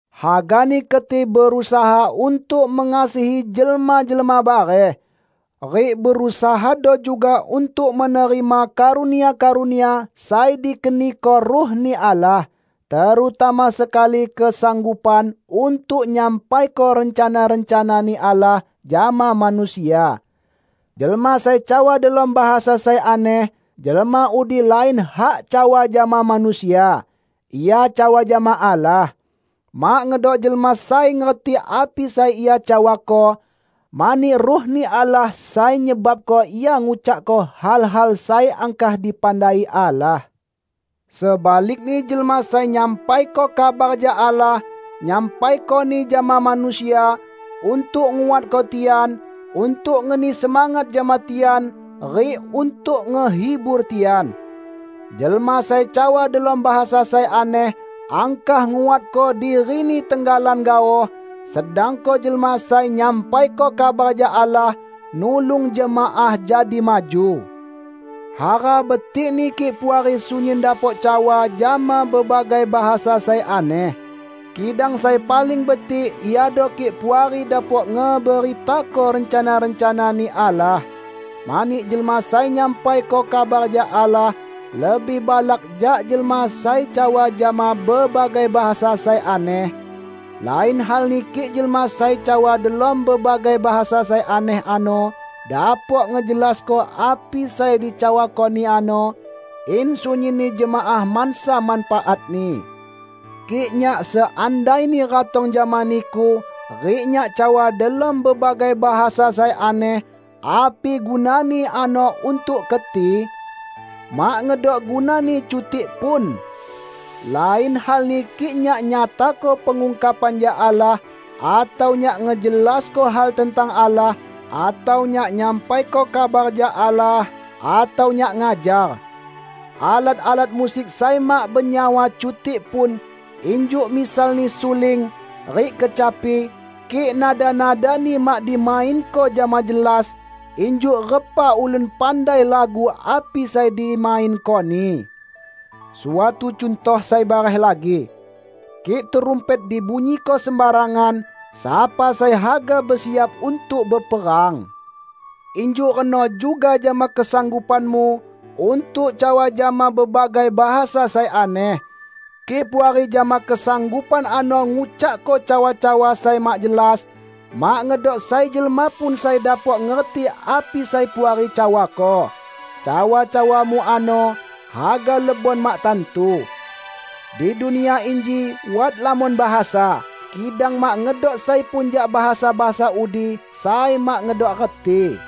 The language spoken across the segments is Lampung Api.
Hagani keti berusaha untuk mengasihi jelma-jelma bareh. Rik berusahado juga untuk menerima karunia-karunia sai dikeniko Ruh-Ni Allah, terutama sekali kesanggupan untuk nyampaiko rencana-rencana-Ni Allah jama manusia. Jelma sai cawa delom bahasa sai aneh, jelma udi lain hak cawa jama manusia; ia cawa jama Allah. Mak ngedok jelma sai ngerti api sai ia cawako, mani Ruh-Ni Allah sai nyebabko ia ngucakko hal-hal sai angkah dipandai Allah. Sebalikni jelma sai nyampaiko kabar jak Allah, nyampaikoni jama manusia; untuk nguatko tian, untuk ngeni semangat jama tian rik untuk ngehibur tian. Jelma sai cawa delom bahasa sai aneh angkah nguatko dirini tenggalan gaoh, sedangko jelma sai nyampaiko kabar jak Allah nulung jemaah jadi maju. Hara betikni kik Puari sunyin dapok cawa jama bebagai bahasa sai aneh. Kidang sai paling betik iado kik Puari dapok ngeberitako rencana-rencana-Ni Allah. Mani jelma sai nyampaiko kabar jak Allah, lebih balak jak jelma sai cawa jama bebagai bahasa sai aneh; lain halni kik jelma sai cawa delom bebagai bahasa sai aneh ano dapok ngejelasko api sai dicawakoni ano, in sunyinni jemaah mansa manfaatni. Kik nyak seandaini ratong jama niku rik nyak cawa delom bebagai bahasa sai aneh, api gunani ano untuk keti? Mak ngedok gunani cutik pun! Lain halni kik nyak nyatako pengungkapan jak Allah, atau nyak ngejelasko hal tentang Allah, atau nyak nyampaiko kabar jak Allah, atau nyak ngajar. Alat-alat musik sai mak benyawa cutik pun, injuk misalni suling rik kecapi, kik nada-nadani mak dimainko jama jelas, injuk repa ulun pandai lagu api sai dimainkoni? Suatu cuntoh sai bareh lagi: Kik trumpet dibunyiko sembarangan, sapa sai haga besiap untuk beperang? Injuk reno juga jama kesanggupanmu untuk cawa jama bebagai bahasa sai aneh. Kik Puari jama kesanggupan ano ngucakko cawa-cawa sai mak jelas, mak ngedok sai jelma pun sai dapok ngerti api sai Puari cawako. Cawa-cawamu ano haga lebon mak tantu. Di dunia inji wat lamon bahasa, kidang mak ngedok sai pun jak bahasa-bahasa udi sai mak ngedok reti.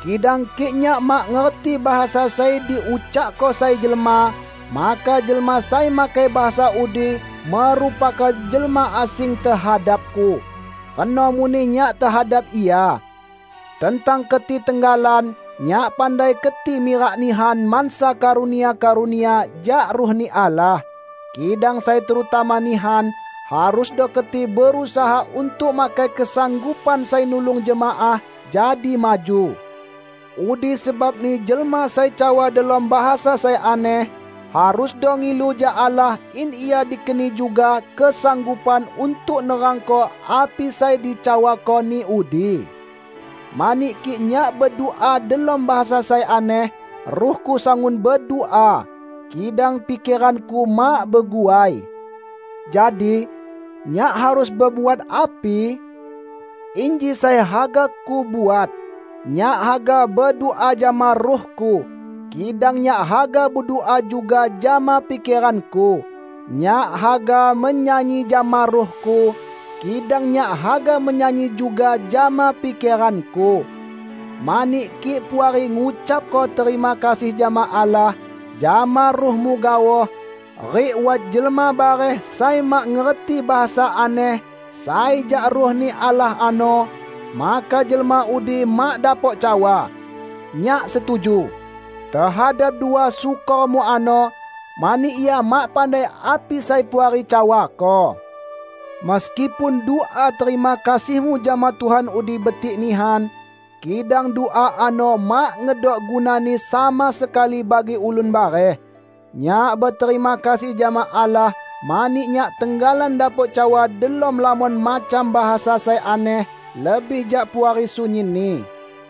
Kidang kik nyak mak ngerti bahasa sai diucakko sai jelma, maka jelma sai makai bahasa udi merupako jelma asing tehadapku; reno muneh nyak tehadap ia. Tentang keti tenggalan, nyak pandai keti mirak nihan mansa karunia-karunia jak Ruh-Ni Allah. Kidang sai terutama nihan, harusdo keti berusaha untuk makai kesanggupan sai nulung jemaah jadi maju. Udi sebabni jelma sai cawa delom bahasa sai aneh, harusdo ngilu jak Allah in ia dikeni juga kesanggupan untuk nerangko api sai dicawakoni udi. Mani kik nyak bedua delom bahasa sai aneh, ruhku sangun bedua, kidang pikeranku mak beguai. Jadi, nyak harus bebuat api? Inji sai haga kubuat: Nyak haga bedua jama ruhku, kidang nyak haga bedua juga jama pikeranku. Nyak haga menyanyi jama ruhku, kidang nyak haga menyanyi juga jama pikeranku. Mani kik Puari ngucapko terima kasih jama Allah jama ruhmu gaoh, rik wat jelma bareh sai mak ngerti bahasa aneh sai jak Ruh-Ni Allah ano, maka jelma udi mak dapok cawa, "Nyak setuju" tehadap dua syukormu ano; mani ia mak pandai api sai Puari cawako. Meskipun dua terima kasihmu jama Tuhan udi betik nihan, kidang dua ano mak ngedok gunani sama sekali bagi ulun bareh. Nyak beterima kasih jama Allah mani nyak tenggalan dapok cawa delom lamon macam bahasa sai aneh lebih jak Puari sunyinni.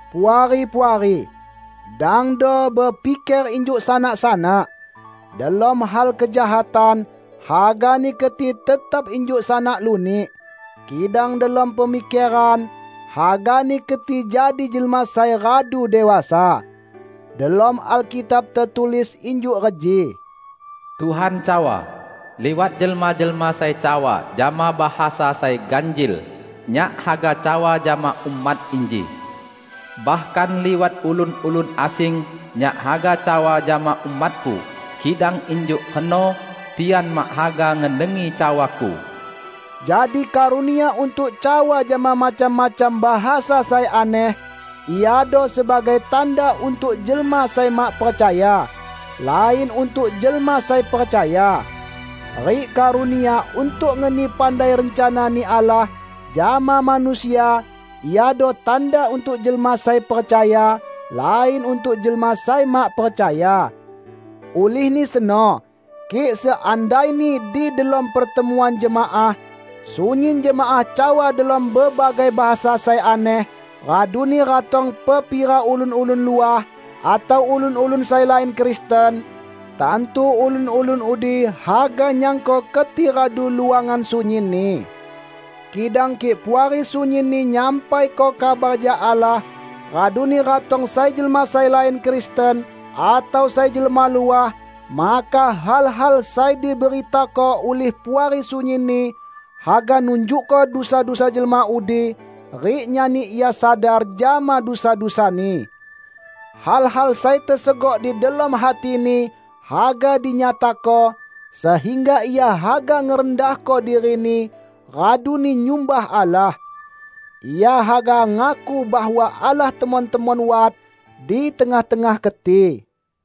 Puari-puari! Dangdo bepiker injuk sanak-sanak. Delom hal kejahatan, hagani keti tetap injuk sanak lunik. Kidang delom pemikeran, hagani keti jadi jelma sai radu dewasa. Delom Alkitab tetulis injuk reji, "Tuhan cawa, 'Liwat jelma-jelma sai cawa jama bahasa sai ganjil, Nyak haga cawa jama umat inji. Bahkan liwat ulun-ulun asing, Nyak haga cawa jama umat-Ku, kidang injuk reno, tian mak haga ngedengi cawa-Ku.' " Jadi karunia untuk cawa jama macam-macam bahasa sai aneh iado sebagai tanda untuk jelma sai mak percaya, lain untuk jelma sai percaya. Rik karunia untuk ngeni pandai rencana-Ni Allah jama manusia iado tanda untuk jelma sai percaya, lain untuk jelma sai mak percaya. Ulihni seno, kik seandaini di delom pertemuan jemaah, sunyin jemaah cawa delom bebagai bahasa sai aneh, raduni ratong pepira ulun-ulun luah, atau ulun-ulun sai lain Kristen, tantu ulun-ulun udi haga nyangko keti radu luangan sunyinni! Kidang kik Puari sunyinni nyampaiko kabar jak Allah, raduni ratong sai jelma sai lain Kristen atau sai jelma luah, maka hal-hal sai diberitako ulih Puari sunyinni haga nunjukko dusa-dusa jelma udi rik nyani ia sadar jama dusa-dusani. Hal-hal sai tesegok di delom hatini haga dinyatako, sehingga ia haga ngerendahko dirini raduni nyumbah Allah. Ia haga ngaku bahwa Allah temon-temon wat di tengah-tengah keti.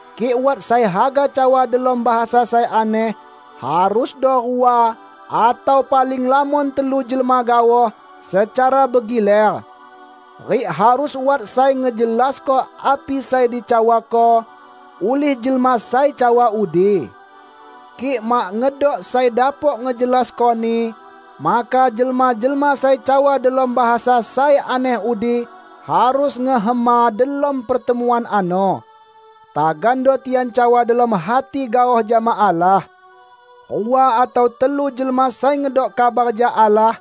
Kik wat sai haga cawa delom bahasa sai aneh, harusdo rua atau paling lamon telu jelma gaoh secara begiler. Rik harus wat sai ngejelasko api sai dicawako ulih jelma sai cawa udi. Kik mak ngedok sai dapok ngejelaskoni, maka jelma-jelma sai cawa delom bahasa sai aneh udi harus ngehema delom pertemuan ano. Tagando tian cawa delom hati gaoh jama Allah. Rua atau telu jelma sai ngedok kabar jak Allah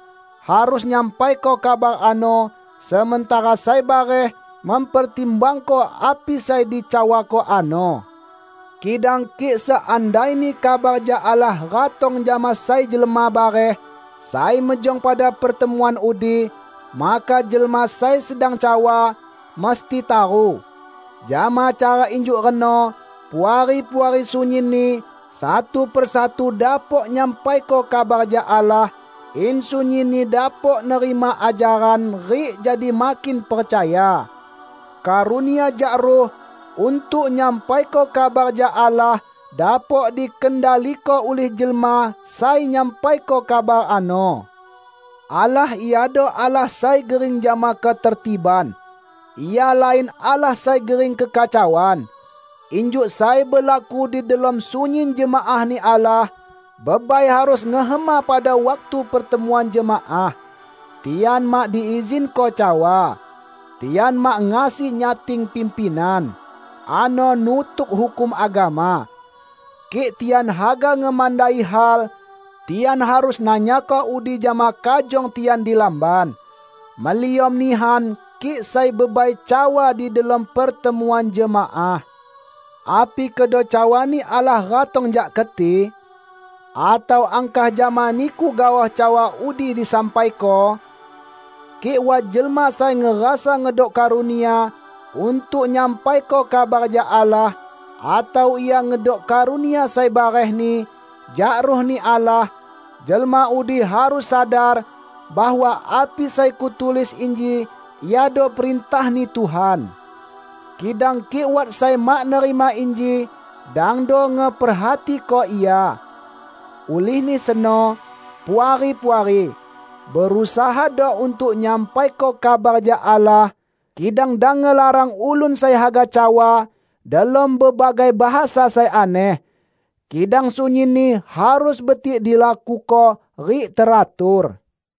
harus nyampaiko kabar ano sementara sai bareh mempertimbangko api sai dicawako ano. Kidang kik seandaini kabar jak Allah ratong jama sai jelma bareh sai mejong pada pertemuan udi, maka jelma sai sedang cawa, mesti taru. Jama cara injuk reno, Puari-puari sunyinni, satu per satu dapok nyampaiko kabar jak Allah; in sunyinni dapok nerima ajaran rik jadi makin percaya. Karunia jak Ruh untuk nyampaiko kabar jak Allah dapok dikendaliko ulih jelma sai nyampaiko kabar ano. Allah iado Allah sai gering jama ketertiban; Ia lain Allah sai gering kekacauan. Injuk sai belaku di delom sunyin jemaah-Ni Allah, bebai harus ngehema pada waktu pertemuan jemaah. Tian mak diizinko cawa. Tian mak ngasi nyating pimpinan; ano nutuk hukum agama. Kik tian haga ngemandai hal, tian harus nanyako udi jama kajong tian di lamban. Meliom nihan kik sai bebai cawa di delom pertemuan jemaah. Api kedo cawa-Ni Allah ratong jak keti? Atau angkah jama niku gaoh cawa udi disampaiko? Kik wat jelma sai ngerasa ngedok karunia untuk nyampaiko kabar jak Allah, atau ia ngedok karunia sai barehni jak Ruh-Ni Allah, jelma udi harus sadar bahwa api sai kutulis inji iado perintah-Ni Tuhan. Kidang kik wat sai mak nerima inji, dangdo ngeperhatiko ia. Ulihni seno, Puari-puari, berusahado untuk nyampaiko kabar jak Allah, kidang dang ngelarang ulun sai haga cawa delom bebagai bahasa sai aneh. Kidang sunyinni harus betik dilakuko rik teratur.